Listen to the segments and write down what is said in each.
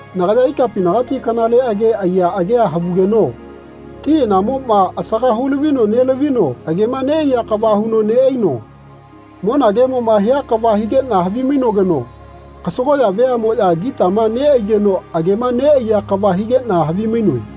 Nagaya ikapinagati kanale age aiya agea havugeno ti anamoꞌma asaga hu-lavino nelavino agema neꞌaiya kava huno neꞌaino monagemoꞌma hia kava higeꞌna havimainogeno kasagoꞌya veaꞌmoꞌya gitama neꞌaigeno agema neꞌaiya kava higeꞌna havimainoe.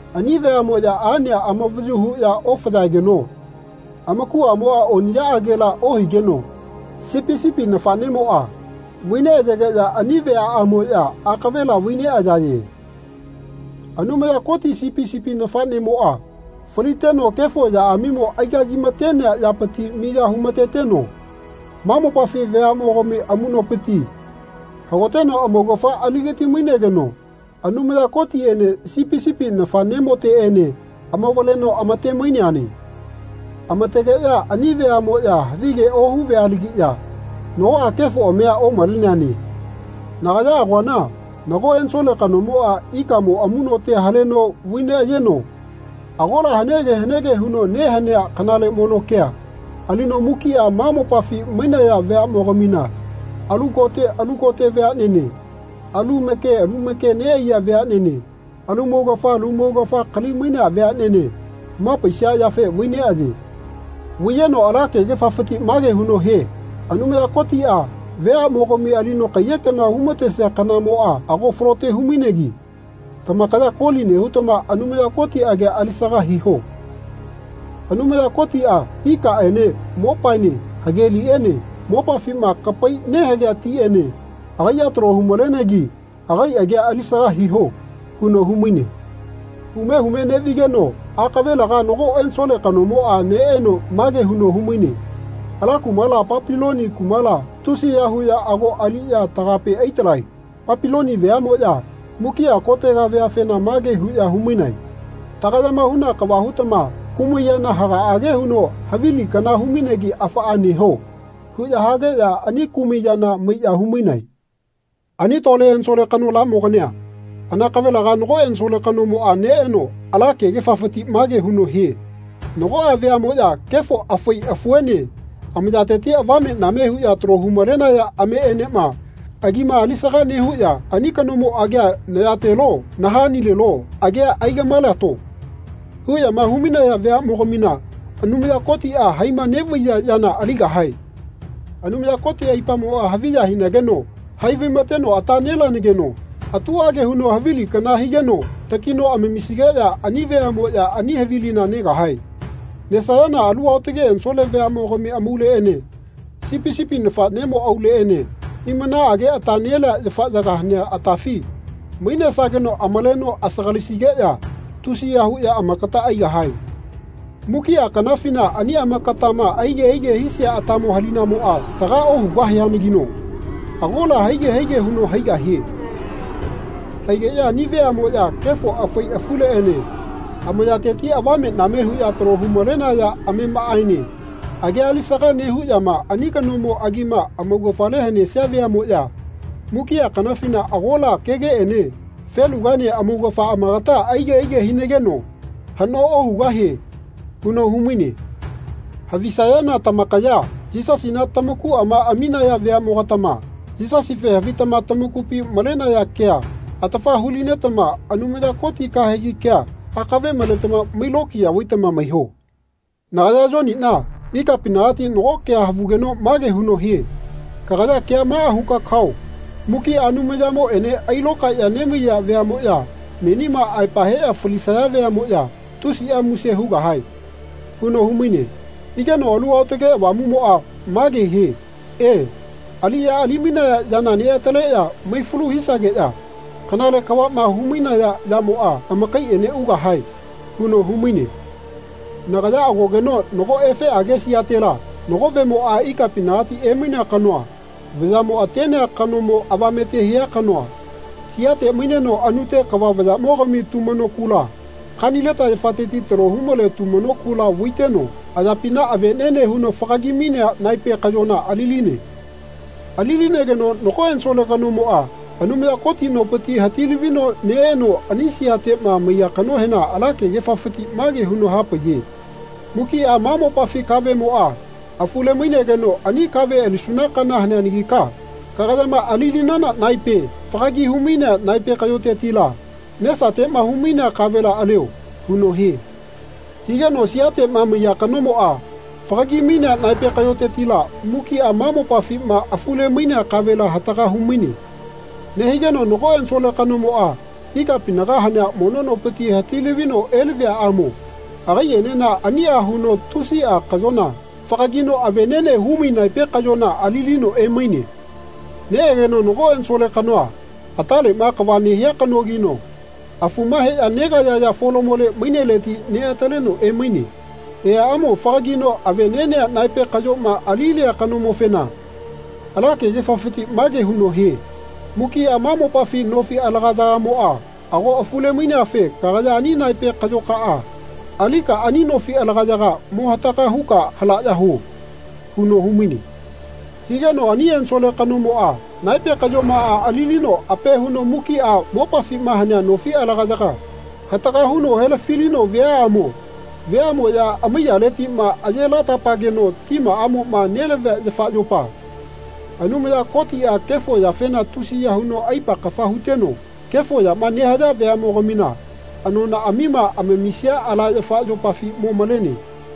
Ani veaꞌmoꞌya aꞌnea amavayu huꞌya ofaeyageno amakuꞌamoꞌa oniꞌyaꞌagela ohigeno Sipi sipi nafaꞌnemoꞌa vai neꞌyageꞌya ani veaꞌamoꞌya akavela vai neꞌayaye. Anumaya Koti Sipi sipi nafaꞌnemoꞌa faliteno kefo yaꞌamimo aigagimatenea yapiti miya humateteno ma mopafi veaꞌmogami amuꞌnopiti hagoteno amaugafa aligati-mainegeno Anumaya Kotiteꞌene Sipi sipi nafaꞌnemoteꞌene amavaleno amate-maineane. Amategeꞌya ani veaꞌmoꞌya havige ohu vealagiꞌya nagoꞌa kefoꞌamia omaleneane. Nagaya agoana nago ensole kanomoꞌa ikaꞌmo amuꞌnote haleno vai neꞌayeno agola hanege hanege huno nehanea kanale mono kea alino mukiꞌa ma mopafi mainaya veaꞌmogamina alu kote alu kote veaꞌnene, alu make lu make neꞌaiya veaꞌnene, alu maugafa lu maugafa kalimainea veaꞌnene hamapaisia yafe vai neꞌaye. Vai-yeno ala kegefafiti mage huno hie “Anumaya Kotiꞌa veaꞌmogami alino kaiyekema humatesia kanamoꞌa ago falote hu-mainegi tamakaya koli nehutama Anumaya Koti agia alisaga hiho. Anumaya Kotiꞌa ikaꞌene mopaene hageliꞌene mopafitiꞌma kapai nehagea tiꞌene agaiꞌa talo hu-malegetama agai agia alisaga hiho.” huno humaine. Hume hume neꞌvigeno akavelega nago ensole kanomoꞌa neꞌeno mage huno humaine “Ala kumala Papiloni kumala tusiya huꞌya ago aliꞌya tagape aitalae. Papiloni veaꞌmoꞌya mukiꞌa kotega veafena mage huꞌya humainae ‘Tagayama huna kava hutama kumai yana hagaꞌage huno havili kana humainegi afaꞌa neho.’ huꞌya hageꞌya ani kumai yana maiꞌya humainae.” Ani lole ensole kanolaꞌmogani anakavela nago ensole kanomoꞌa neꞌeno ala kegefafiti mage huno hie “Nagoꞌa veaꞌmoꞌya kefo afai afuene amayateti avave-name huꞌya talo hu-malenaya ameꞌeneꞌma agima alisagama nehuꞌya ‘Ani kanomo agia nayatelo nahanilelo agia aigaꞌmaelato.’ huꞌyama hu-mainaya veaꞌmogamina Anumaya Kotiꞌa haima neꞌvaiya yana aligahae. Anumaya Koti aipamoꞌa haviya hinageno hai vaimateno ata nelenageno atuꞌage huno havili kana higeno takino amamisigeꞌya ani veaꞌmoꞌya ani havilina negahae. Nesayana alu aotage ensole veaꞌmogami amauleꞌene Sipi sipi nafaꞌnemo auleꞌene hiꞌmanaꞌage ata nelea yafaꞌyaga hanea atafi mainesageno amaleno asagalisigeꞌya tusiya huꞌya amakata aigahie. Mukiꞌa kanafina ani amakatama aige aige hisia atamo halinamoꞌa taga ohugahianagino agola haige haige huno haigahie. Haigeꞌya ani veaꞌmoꞌya kefo afai afuleꞌene amayateti avame-name huꞌya talo hu-malenaya amemaꞌaene agia alisaga nehuꞌyama ani kanomo agima amaugafale hanesia veaꞌmoꞌya mukiꞌa kanafina agola kegeꞌene felugaene amaugafa amakata aige aige hinageꞌya haꞌno ohugahie.” huno humaine. Havisayana tamakaya Yisasina tamakuꞌama aminaya veaꞌmogatama Yisasife havitama tamakupi malenaya kea atafa hu-linetama Anumaya Koti kahegi kema akave maletama mailokiya vaitama maiho. Nagaya Yoniꞌna ikapinagati nago kea havugeno mage huno hie “Kagaya kea maꞌa huka kao mukiꞌa Anumayamoꞌene ailokaeꞌya nemaiya veaꞌmoꞌya menima aepa heꞌya falisaya veaꞌmoꞌya tusiꞌa muse hugahae.” huno humaine. Higeno Alu Aotage Avamuꞌmoꞌa mage hie “E, aliꞌya ali-mainaya yana neꞌataleꞌya maifalu hisageꞌya kanale kavaꞌma hu-mainaya yamoꞌa amakaiꞌene ugahae.” huno humaine. Nagaya agogeno nago efeꞌage siatela nago vemoꞌa ikapinagati emainea kanoa vayaꞌmo atenea kano avamete hia kanoa siate maineno anute kava vayaꞌmogami tumano kula, kanileta yafateti talo humale tumano kula vaiteno ayapina aveꞌneꞌne huno fagagi-mainea naepe kaꞌyona ali-line. Ali-linegeno nago ensole kanomoꞌa Anumaya Koti nopiti hati-lavino neꞌeno ani siateꞌma maiya kanohena ala kegefafiti mage huno hapaiye “Mukiꞌa ma mopafi kaveꞌmoꞌa afule-mainegeno ani kave alisuna kana haneanagika kagayama ali-linana naepe fagagi humainea naepe kaꞌyotetila nesateꞌma humainea kavela alio.” huno hie. Higeno siateꞌma maiya kanomoꞌa fagagi-mainea naepe kaꞌyotetila mukiꞌa ma mopafima afule-mainea kavela hataga humaine. Nehigeno nago ensole kanomoꞌa ikapinaga hanea mono nopiti hati-lavino elaviaꞌamo agaiꞌenena aniꞌa huno tusiꞌa kaꞌyona fagagino aveꞌneꞌne huno naepe kaꞌyona ali-lino emaine. Neꞌegeno nago ensole kanoa ataleꞌma kava nehia kanogino afuma heꞌya negaeyaya folamole maineleti neꞌataleno emaine. Eaꞌamo fagagino aveꞌneꞌnea naepe kaꞌyoma ali-lia kanomofena ala kegefafiti mage huno hie “Mukiꞌa mopafi nofi alagayagamoꞌa ago afule-maineafe kagaya ani naepe kaꞌyokaꞌa alika ani nofi alagayaga mo hataga huka halaꞌya huo.” huno humaine. Higeno ani ensole kanomoꞌa naepe kaꞌyomaꞌa ali-lino ape huno mukiꞌa mopafima hanea nofi alagayaga hataga huno helafi-lino viaꞌamo veaꞌmoꞌya amaiyaletiꞌma aye lata-pageno timaꞌamoꞌma nelavia yafa yopa, Anumaya Kotiꞌa kefo yafena tusiya huno aipa kafa huteno kefo yama nehaya veaꞌmogamina anonaꞌamima amamisia ala yafa yopafi mo malene.